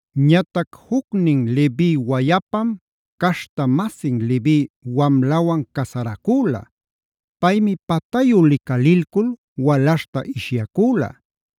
Ñatac jucnin Levi wayapam caśhta-masin Levi wamlawan casaracüla. Paymi patayu licalilcul walaśhta ishyacüla.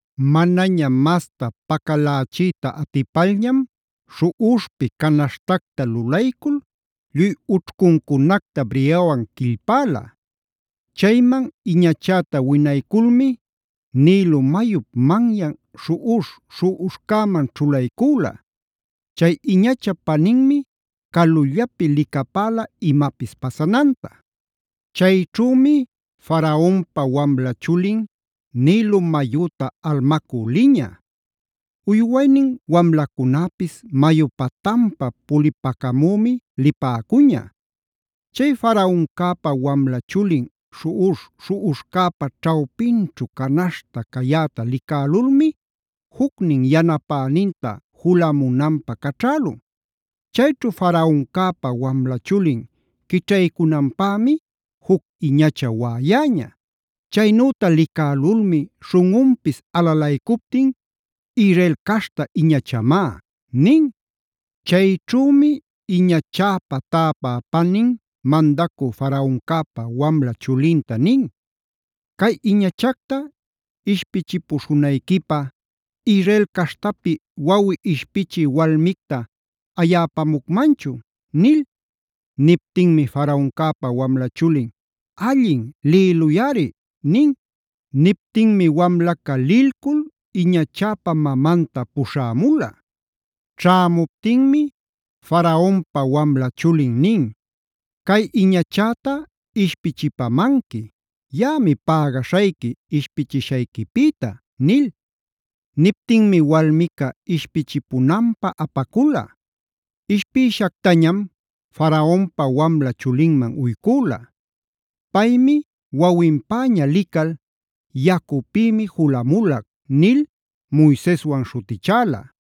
Manaña masta pacalächiyta atipalñam śhuꞌuśhpi canaśhtacta lulaycul lluy ućhcuncunacta briyawan quillpäla. Chayman iñachäta winayculmi Nilo mayup manyan śhuꞌuśh-śhuꞌuśhcäman ćhulaycüla. Chay iñachap paninmi calullapi licapäla imapis pasananta. Chayćhümi Faraonpa wamla chulin, Nilo mayüta almacü liñä. Uywaynin wamlacunäpis mayu patanpa pulipacamümi lipäcuña. Chay Faraoncäpa wamla chulin śhuꞌuśh-śhuꞌuśhcäpa ćhawpinćhu canaśhta cayäta licälulmi jucnin yanapäninta julamunanpä caćhälun. Chayćhu Faraoncäpa wamla chulin quićhaycunanpämi juc iñacha waꞌayäña. Chaynüta licälulmi śhunꞌunpis alalaycuptin: “Israel caśhta iñachamá” nin. Chayćhümi iñachäpa täpä panin mandacü Faraoncäpa wamla chulinta nin: “¿Cay iñachacta ishpichipuśhunayquipä, Israel caśhtapi wawi ishpichï walmicta ayäpamucmanchun?” nil. Niptinmi Faraoncäpa wamla chulin: “Allin, lïluyꞌari” nin. Niptinmi wamlaca lilcul iñachäpa mamanta puśhämula. Ćhämuptinmi Faraonpa wamla chulin nin: “Cay iñachäta ishpichipamanqui. Yaꞌami pägaśhayqui ishpichishayquipïta” nil. Niptinmi walmica ishpichipunanpä apacula. Ishpïshactañam Faraonpa wamla chulinman uycüla. Paymi wawinpäña lical: “Yacupïmi julamulac” nil Moiseswanb śhutichäla.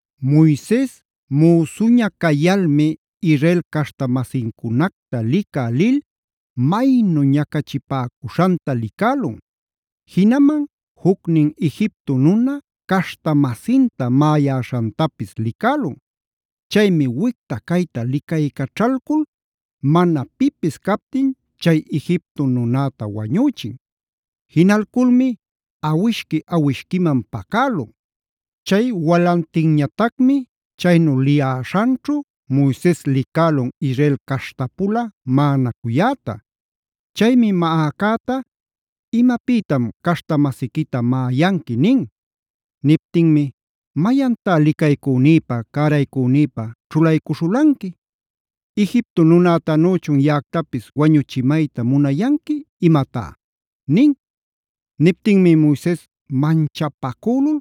Moises müsuña cayalmi Israel caśhta-masincunacta licä lil maynu ñacachipäcuśhanta licälun.c Jinaman jucnin Egipto nuna caśhta-masinta maꞌayäśhantapis licälun. Chaymi wicta-cayta licaycaćhalcul mana pipis captin chay Egipto nunäta wañüchin. Jinalculmi awishqui-awishquiman pacälun. Chay walantinñatacmi chaynu liyäśhanćhu Moises licälun Israel caśhtapula maꞌanacuyäta. Chaymi maꞌacäta: “¿Imapïtam caśhta-masiquita maꞌayanqui?” nin. Niptinmi: “¡Mayantá licaycünïpä, cäraycünïpä ćhulaycuśhulanqui! ¡Egipto nunätanüchun yaꞌactapis wañuchimayta munayanqui imatá!” nin. Niptinmi Moises manchapacücul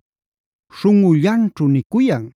śhunꞌullanćhu nicuyan: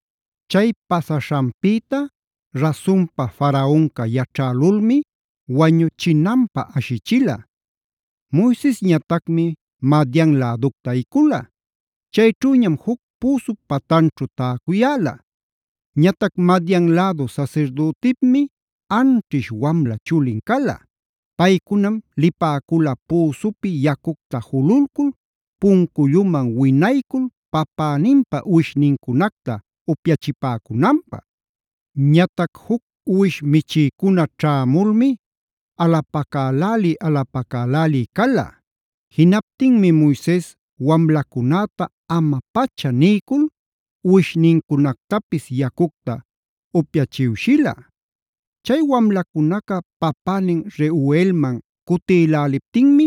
Chay pasaśhanpïta rasunpa Faraonca yaćhälulmi wañuchinanpä ashichila. Moisesñatacmi Madiane läducta ayicula. Chayćhüñam juc püsup patanćhu täcuyäla. Ñatac Madian lädu sasirdütipmi anćhish wamla chulin cala. Paycunam lipäcula püsupi yacucta jululcul punculluman winaycul papäninpa uwishnincunacta upyachipäcunanpä. Ñatac juc uwish michïcuna ćhämulmi alapacaläli-alapacaläli cala. Jinaptinmi Moises wamlacunäta ama-pacha niycul uwishnincunactapis yacucta upyachiwshila. Chay wamlacunaca papänin Reuelman cutïläliptinmi: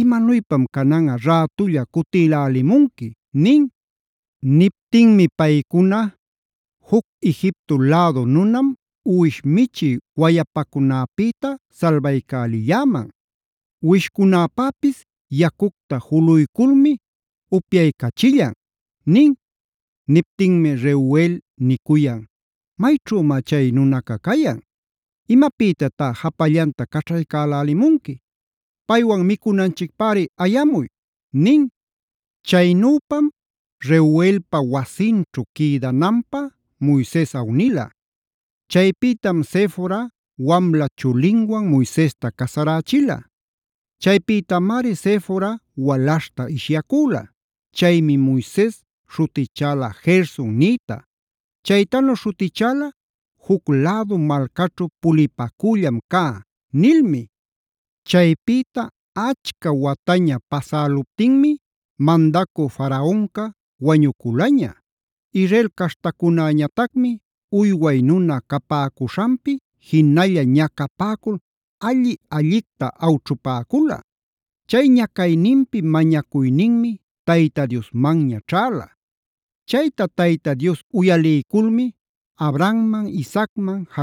“¿Imanuypam cananꞌa rätulla cutïlälimunqui?” nin. Niptinmi paycuna: “Juc Egipto lädu nunam uwish michï wayapacunäpïta salbaycälilläman. Uwishcunäpäpis yacucta juluyculmi upyaycachillan” nin. Niptinmi Reuel nicuyan: “¿Mayćhümá chay nunaca cayan? ¿Imapïtatá japallanta caćhaycälälimunqui? ¡Paywan micunanchicpäri ayamuy!” nin. Chaynüpam Reuelpa wasinćhu quïdananpä Moises awnila. Chaypïtam Sefora wamla chulinwan Moisesta casarächila. Chaypïtamari Sefora walaśhta ishyacüla. Chaymi Moises śhutichäla Gersonf nïta. Chaytanu śhutichäla “juc lädu malcaćhu pulipacüllam cá” nilmi. Chaypïta achca wataña pasäluptinmi mandacü Faraonca wañuculaña. Israel caśhtacunäñatacmi uyway nuna capäcuśhanpi jinalla ñacapäcul alli-allicta awćhupäcula. Chay ñacayninpi mañacuyninmi Tayta Diosmanña ćhäla. Chayta Tayta Dios uyaliyculmi Abrahamman, Isaacman,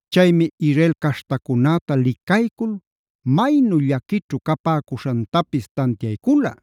Chaymi Israel caśhtacunäta licaycul maynu llaquićhu capäcuśhantapis tantiaycula.